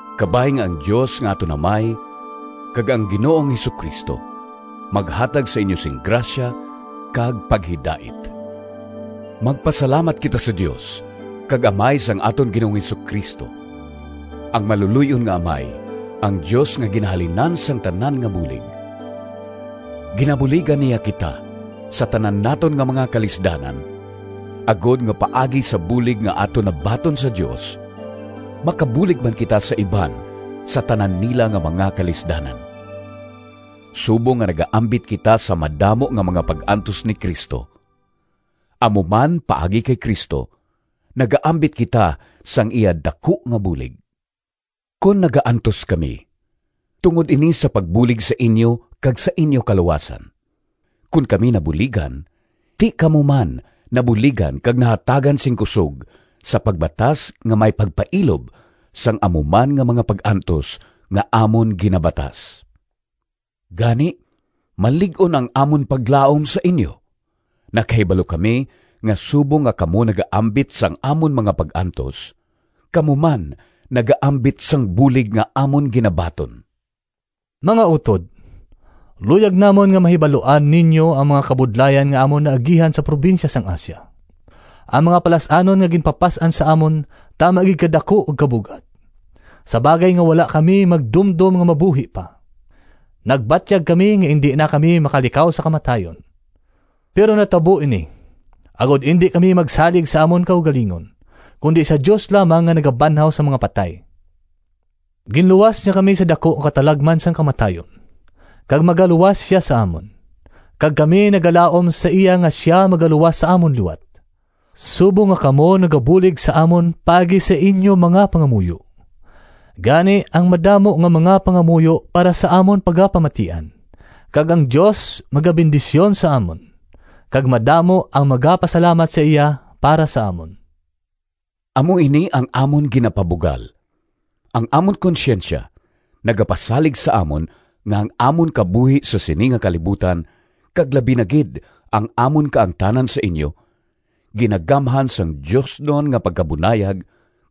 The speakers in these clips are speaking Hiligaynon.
Kabay nga ang Dios nga aton Amay kag ang Ginoong Jesu-Cristo maghatag sa inyo sing grasya kag paghidait. Magpasalamat kita sa Dios kag Amay sang aton Ginoong Jesu-Cristo, ang maluloy-on nga Amay, ang Dios nga ginahalinan sang tanan nga bulig! Ginabuligan niya kita sa tanan naton nga mga kalisdanan, agod nga paagi sa bulig nga aton nabaton sa Dios, makabulig man kita sa iban sa tanan nila nga mga kalisdanan. Subong nga nagaambit kita sa madamo nga mga pag-antos ni Cristo, amo man paagi kay Cristo nagaambit kita sang iya daku nga bulig. Kon nagaantos kami, tungod ini sa pagbulig sa inyo kag sa inyo kaluwasan. Kon kami nabuligan, ti kamo man nabuligan kag nahatagan sing kusog sa pagbatas nga may pagpailob sang amo man nga mga pag-antos nga amon ginabatas. Gani, malig-on ang amon paglaom sa inyo. Nakahibalo kami nga subong nga kamo nagaambit sang amon mga pag-antos, kamo man nagaambit sang bulig nga amon ginabaton. Mga utod, luyag namon nga mahibaluan ninyo ang mga kabudlayan nga amon naagihan sa probinsya sang Asia. Ang mga palas-anon nga ginpapas-an sa amon tama gid kadaku kag kabug-at, sa bagay nga wala kami magdumdom nga mabuhi pa. Nagbatyag kami nga indi na kami makalikaw sa kamatayon. Pero natabo ini, agod indi kami magsalig sa amon kaugalingon, kundi sa Dios lamang nga nagabanhaw sang mga patay. Ginluwas niya kami sa daku nga katalagman sang kamatayon, kag magaluwas sia sa amon, kag kami nagalaom sa iya nga sia magaluwas sa amon liwat, subong nga kamo nagabulig sa amon paagi sa inyo mga pangamuyo. Gani ang madamo nga mga pangamuyo para sa amon pagapamatian, kag ang Dios magabendisyon sa amon, kag madamo ang magapasalamat sa iya para sa amon. Amo ini ang amon ginapabugal: ang amon konsyensya nagapasalig sa amon nga ang amon kabuhi sa sini nga kalibutan, kag labi na gid ang amon kaangtanan sa inyo, ginagamhan sang diosnon nga pagkabunayag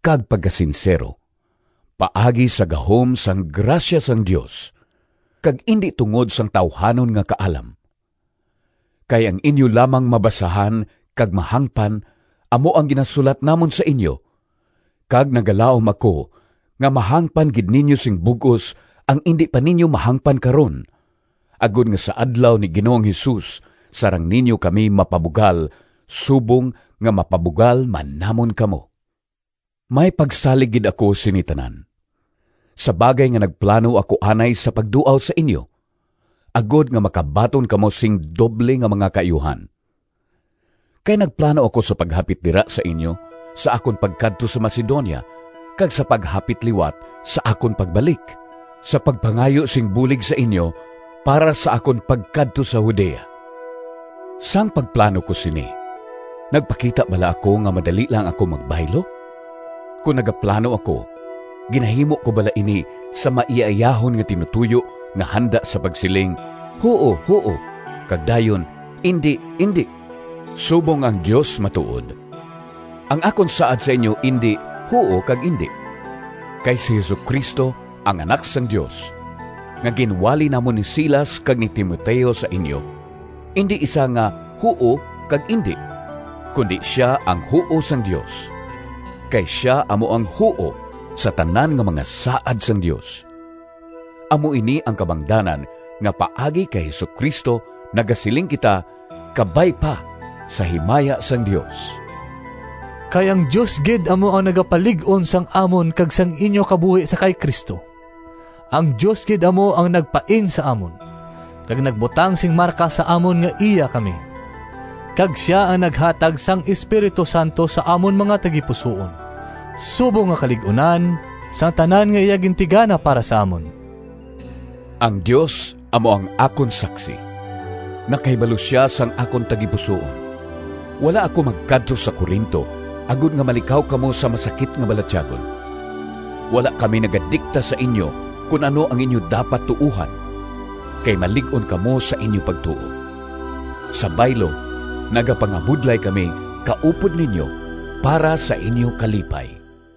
kag pagkasinsero, paagi sa gahom sang grasya sang Dios, kag indi tungod sang tawuhanon nga kaalam. Kay ang inyo lamang mabasahan kag mahangpan amo ang ginasulat namon sa inyo. Kag nagalaom ako nga mahangpan gid ninyo sing bug-os ang indi pa ninyo mahangpan karon, agod nga sa Adlaw ni Ginoong Jesus sarang ninyo kami mapabugal subong nga mapabugal man namon kamo. May pagsalig gid ako sini tanan, sa bagay nga nagplano ako anay sa pagduaw sa inyo, agod nga makabaton kamo sing doble nga mga kaayuhan. Kay nagplano ako sa paghapit dira sa inyo sa akon pagkadto sa Macedonia kag sa paghapit liwat sa akon pagbalik, sa pagpangayo sing bulig sa inyo para sa akon pagkadto sa Judea. Sang pagplano ko sini, nagpakita bala ako nga madali lang ako magbaylo? Kon nagaplano ako, ginahimo ko bala ini sa maiyaiyahon nga tinutoyo nga handa sa pagsiling, “Huo, huo,” kag dayon “Indi, indi”? Subong nga ang Dios matuod, ang akon saad sa inyo indi “Huo” kag “Indi.” Kay si Jesu-Cristo, ang Anak sang Dios, nga ginwali namon ni Silas kag ni Timoteo sa inyo, indi isa nga “Huo” kag “Indi,” kundi sia ang “Huo” sang Dios. Kay sia amo ang “Huo” sa tanan nga mga saad sang Dios. Amo ini ang kabangdanan nga paagi kay Jesu-Cristo nagasiling kita “Kabay pa” sa himaya sang Dios. Kay ang Dios gid amo ang nagapalig-on sang amon kag sang inyo kabuhi sa kay Cristo. Ang Dios gid amo ang nagpain sa amon, kag nagbutang sing marka sa amon nga iya kami, kag sia ang naghatag sang Espiritu Santo sa amon mga tagipusoon subong nga kalig-unan sang tanan nga iya gintigana para sa amon. Ang Dios amo ang akon saksi. Nakahibalo sia sang akon tagipusoon! Wala ako magkadto sa Corinto agod nga malikaw kamo sa masakit nga balatyagon. Wala kami nagadikta sa inyo kon ano ang inyo dapat tuohan, kay malig-on kamo sa inyo pagtuo. Sa baylo, nagapangabudlay kami kaupod ninyo para sa inyo kalipay.